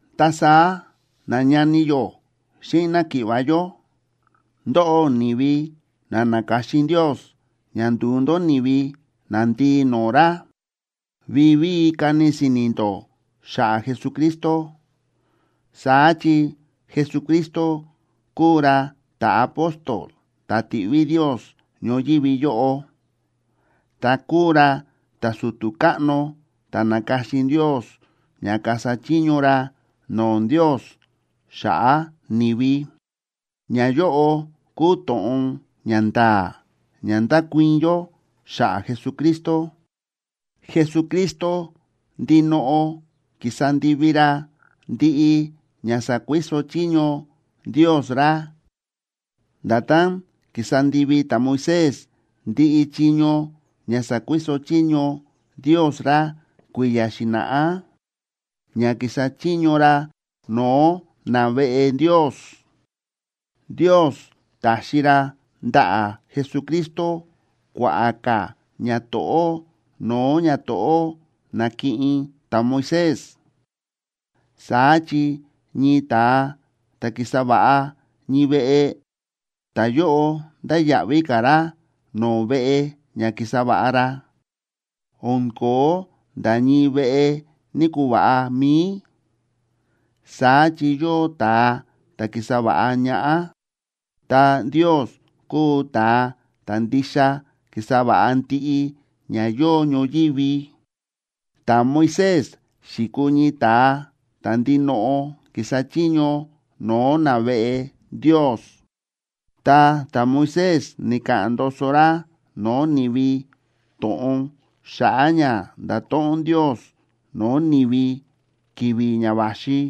Ta saá nañani yó xíꞌin náki̱ꞌva̱ yó, ndóꞌó ni̱vi na na̱ka̱xin Ndios ña ndu̱u ndó ni̱vi nandii no̱o̱ ra, vivíi kani si̱ni̱ ndó xa̱ꞌa̱ Jesucristo. Saá chi Jesucristo kúu ra ta̱apóstol ta̱ ti̱ꞌví Ndios ñoyívi yóꞌo, ta kúu ra ta̱su̱tu̱ káꞌno ta̱ na̱ka̱xin Ndios ña kasa chiño ra no̱o̱ Ndios xa̱ꞌa̱ ni̱vi. Ñayóꞌo kúu to̱ꞌon ña nda̱a̱ ña ndákuii̱n yó xa̱ꞌa̱ Jesucristo. Jesucristo ndinoꞌo ki̱sa ndivi ra ndiꞌi ña sa̱kuiso chiño Ndios ra, nda̱tán ki̱sa ndivi ta̱Moisés ndiꞌi chiño ña sa̱kuiso Ndios ra kui̱ya̱ xi̱na̱ꞌá, ña ki̱sa chiño ra no̱o̱ naveꞌe Ndios. Ndios ta̱xi ra ndaꞌa̱ Jesucristo kua̱ꞌa̱ ka̱ ñato̱ꞌó no̱o̱ ñato̱ꞌó na̱kiꞌin ta̱Moisés, saá chi ñii ta̱a ta̱ ki̱sa va̱ꞌa ñii veꞌe, ta̱yóꞌo ndáya̱ꞌví ka̱ ra no̱o̱ veꞌe ña ki̱sa va̱ꞌa ra. O̱n ko̱ó nda̱ ñii veꞌe ni̱‑kuva̱ꞌa mi̱i, saá chi yóo ta̱a ta̱ ki̱sa va̱ꞌa ñaꞌá, ta Ndios kúu ta̱a ta̱ ndixa ki̱sa va̱ꞌa ndiꞌi ña yóo ñoyívi. Ta̱Moisés xi̱kuu ñii ta̱a ta̱ ndinoꞌo ki̱sa chiño no̱o̱ naveꞌe Ndios, ta ta̱Moisés ni̱ka̱ꞌa̱n ndoso ra no̱o̱ ni̱vi to̱ꞌon xa̱ꞌa̱ ña ndato̱ꞌon Ndios no̱o̱ ni̱vi ki̱vi̱ ña va̱xi.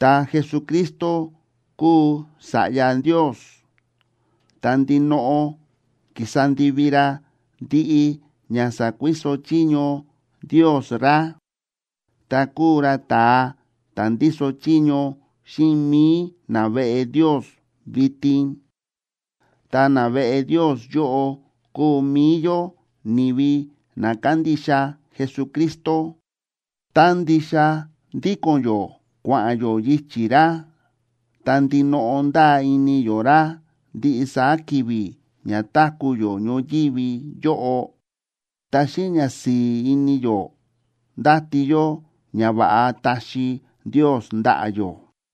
Ta Jesucristo kúu Sa̱ꞌya Ndios, ta ndinoꞌo ki̱sa ndivi ra ndiꞌi ña sa̱kuiso chiño Ndios ra, ta kúu ra ta̱a ta̱ ndíso chiño xíꞌin mi̱i naveꞌe Ndios vitin. Ta naveꞌe Ndios yóꞌo kúu mi̱i yó ni̱vi na kándixa Jesucristo, tá ndixa ndíko̱n yó kua̱ꞌa̱n yó yichi̱ ra, ta ndinoꞌo ndáa ini yó ra ndiꞌi saá ki̱vi̱ ña táku̱ yó ñoyívi yóꞌo, ta xíꞌin ñasi̱i̱ ini yó ndáti yó ñava̱ꞌa taxi Ndios ndaꞌa̱ yó.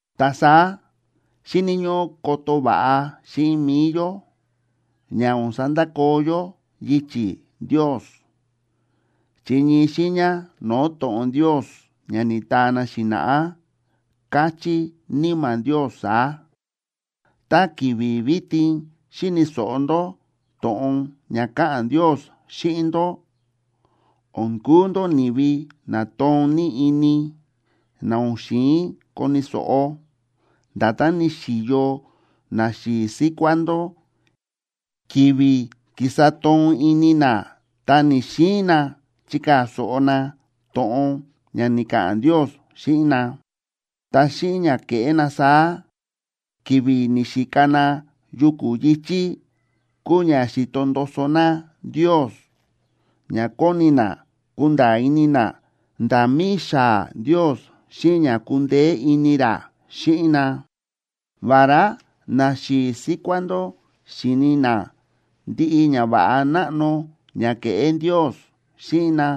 Ta saá xíni̱ ñóꞌó koto va̱ꞌa xíꞌin mi̱i yó, ña o̱n sandakoo yó yichi̱ Ndios, chi ñii xiiña no̱o̱ to̱ꞌon Ndios ña ni̱taa na xi̱na̱ꞌá, káchí Níma̱ Ndios saá: Tá ki̱vi̱ vitin xíni̱ so̱ꞌo ndó to̱ꞌon ña káꞌa̱n Ndios xíꞌin ndó, o̱n kuu ndó ni̱vi na toon ní ini, na o̱n xi̱in koni̱ so̱ꞌo, nda̱tán ni̱xi̱yo naxi̱i̱ síkuá ndó ki̱vi̱ ki̱sa toon ini na ta ni̱‑xiin na chikaa̱ so̱ꞌo na to̱ꞌon ña ni̱ka̱ꞌa̱n Ndios xíꞌin na. Ta xíꞌin ña ke̱ꞌé na saá ki̱vi̱ ni̱xika na yuku̱ yi̱chí, kúu ña xi̱to ndoso na Ndios ña kóni na kunda̱a̱ ini na nda̱ mi̱i xaa̱ Ndios xíꞌin ña kundeé ini ra xíꞌin na. Vará naxi̱i̱ síkuá ndó xi̱ni na ndiꞌi ñava̱ꞌa náꞌno ña ke̱ꞌé Ndios xíꞌin na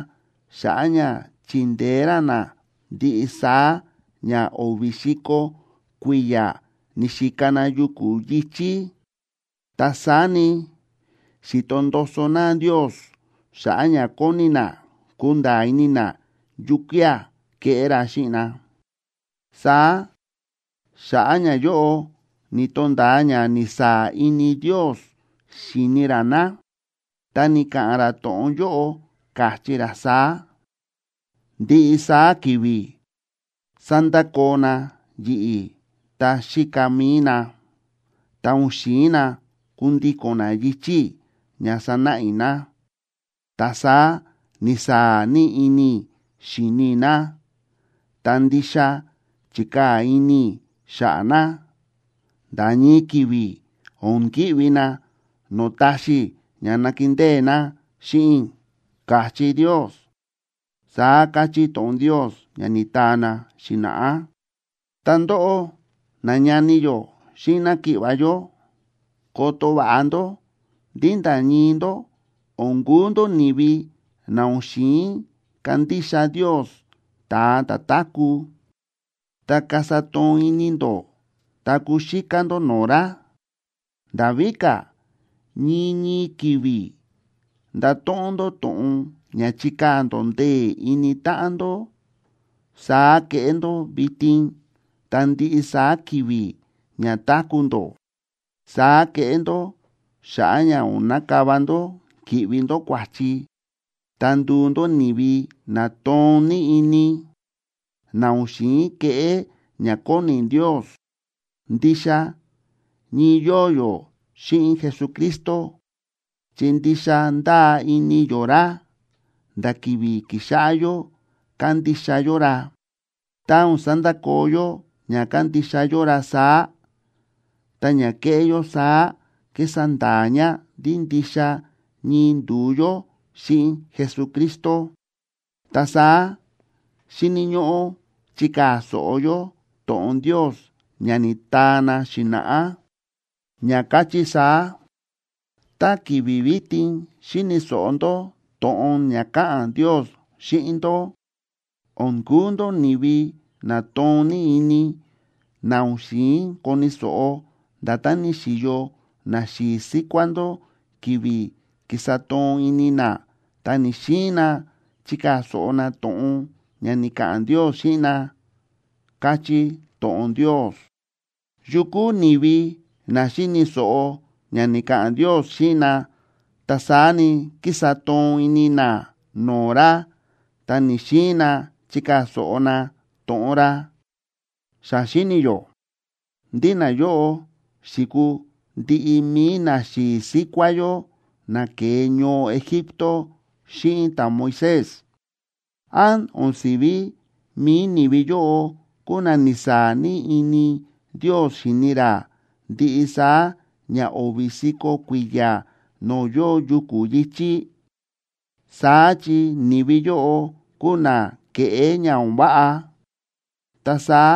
xa̱ꞌa̱ ña chindeé ra na ndiꞌi saá ña o̱vi̱ si̱ko̱ kui̱ya̱ ni̱xika na yuku̱ yi̱chí, ta saá ni, xi̱to ndoso na Ndios xa̱ꞌa̱ ña kóni na kunda̱a̱ ini na yukía̱ keꞌé ra xíꞌin na. Saá xa̱ꞌa̱ ñayóꞌo, ni̱to̱nda̱a ña ni̱saa̱ ini Ndios xi̱ni ra na, ta ni̱ka̱ꞌa̱n ra to̱ꞌon yóꞌo, káchí ra saá: “Ndiꞌi saá ki̱vi̱ sándakoo na yi̱ꞌi̱ ta xíka mi̱i na, ta o̱n xi̱in na kundíko̱n na yichi̱ i̱ ña sa̱náꞌa i̱ na.” Ta saá ni̱saa̱ ní ini i̱ xíni i̱ na, ta ndixa chi̱kaa̱ ini i̱ xa̱ꞌa̱ na: “Nda̱ ñii ki̱vi̱, o̱n ki̱ꞌvi na no̱o̱ taxi i̱ ña nakindée na xíꞌin i̱”, káchí Ndios, saá káchí to̱ꞌon Ndios ña ni̱taa na xi̱na̱ꞌá. Ta ndóꞌó, nañani yó xíꞌin náki̱ꞌva̱ yó, koto va̱ꞌa ndó ndí nda̱ ñii ndó o̱n kuu ndó ni̱vi na o̱n xi̱in kandixa Ndios ta̱a ta̱ táku̱, ta kasa toon ini ndó ta kuxíká ndó no̱o̱ ra. Nda̱ víka̱, ñii ñii ki̱vi̱ ndato̱ꞌon ndó to̱ꞌon ña chikaa̱ ndó ndee̱ ini táꞌan ndó, saá keꞌé ndó vitin ta ndiꞌi saá ki̱vi̱ ña táku̱ ndó. Saá keꞌé ndó xa̱ꞌa̱ ña o̱n nakava ndó ki̱ꞌvi ndó kua̱chi, ta nduu ndó ni̱vi na toon ní ini, na o̱n xi̱in keꞌé ña kóni Ndios. Ndixa ñii yóo yó xíꞌin Jesucristo, chi ndixa ndáa ini yó ra nda̱ ki̱vi̱ ki̱xáꞌá yó kándixa yó ra. Tá o̱n sandakoo yó ña kándixa yó ra saá, ta ña kéꞌé yó saá kísa nda̱a̱ ña ndí ndixa ñii ndu̱u yó xíꞌin Jesucristo. Ta saá xíni̱ ñóꞌó chikaa̱ so̱ꞌo yó to̱ꞌon Ndios ña ni̱taa na xi̱na̱ꞌá, ña káchí saá: Tá ki̱vi̱ vitin xíni̱ so̱ꞌo ndó to̱ꞌon ña káꞌa̱n Ndios xíꞌin ndó, o̱n kuu ndó ni̱vi na toon ní ini, na o̱n xi̱in koni̱ so̱ꞌo, nda̱tán ni̱xi̱yo naxi̱i̱ síkuá ndó ki̱vi̱ ki̱sa toon ini na ta ni̱‑xiin na chikaa̱ so̱ꞌo na to̱ꞌon ña ni̱ka̱ꞌa̱n Ndios xíꞌin na, káchí to̱ꞌon Ndios. ¿Yu kúu ni̱vi na xi̱ni̱ so̱ꞌo ña ni̱ka̱ꞌa̱n Ndios xíꞌin na, ta saá ni, ki̱sa toon ini na no̱o̱ ra ta ni̱‑xiin na chikaa̱ so̱ꞌo na to̱ꞌon ra? Xa xíni̱ yó ndí nayóꞌo xi̱kuu ndiꞌi mi̱i naxi̱i̱ síkuá yó na ke̱e ñoo Egipto xíꞌin ta̱Moisés. ¿Án o̱n si̱ví mi̱i ni̱vi yóꞌo kúu na ni̱saa̱ ní ini Ndios xi̱ni ra ndiꞌi saá ña o̱vi̱ si̱ko̱ kui̱ya̱ no̱o̱ yóo yuku̱ yi̱chí? Saá chi ni̱vi yóꞌo kúu na ke̱ꞌé ña o̱n váꞌa, ta saá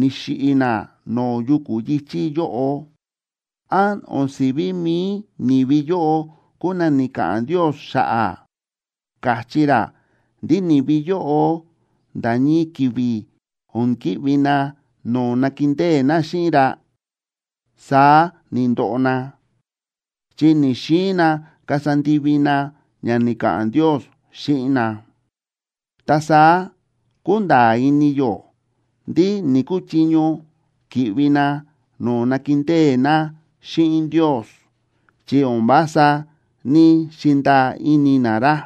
ni̱xiꞌi̱ na no̱o̱ yuku̱ yi̱chí yóꞌo. ¿Án o̱n si̱ví mi̱i ni̱vi yóꞌo kúu na ni̱ka̱ꞌa̱n Ndios xa̱ꞌa̱, káchí ra ndí ni̱vi yóꞌo nda̱ ñii ki̱vi̱ o̱n ki̱ꞌvi na no̱o̱ nakindée na xíꞌin ra? Saá ni̱ndoꞌo na, chi ni̱‑xiin na kasa ndivi na ña ni̱ka̱ꞌa̱n Ndios xíꞌin na. Ta saá kúnda̱a̱ ini yó ndí ni̱‑kuchiño ki̱ꞌvi na no̱o̱ nakindée na xíꞌin Ndios, chi o̱n vása ní‑xindaa ini na ra.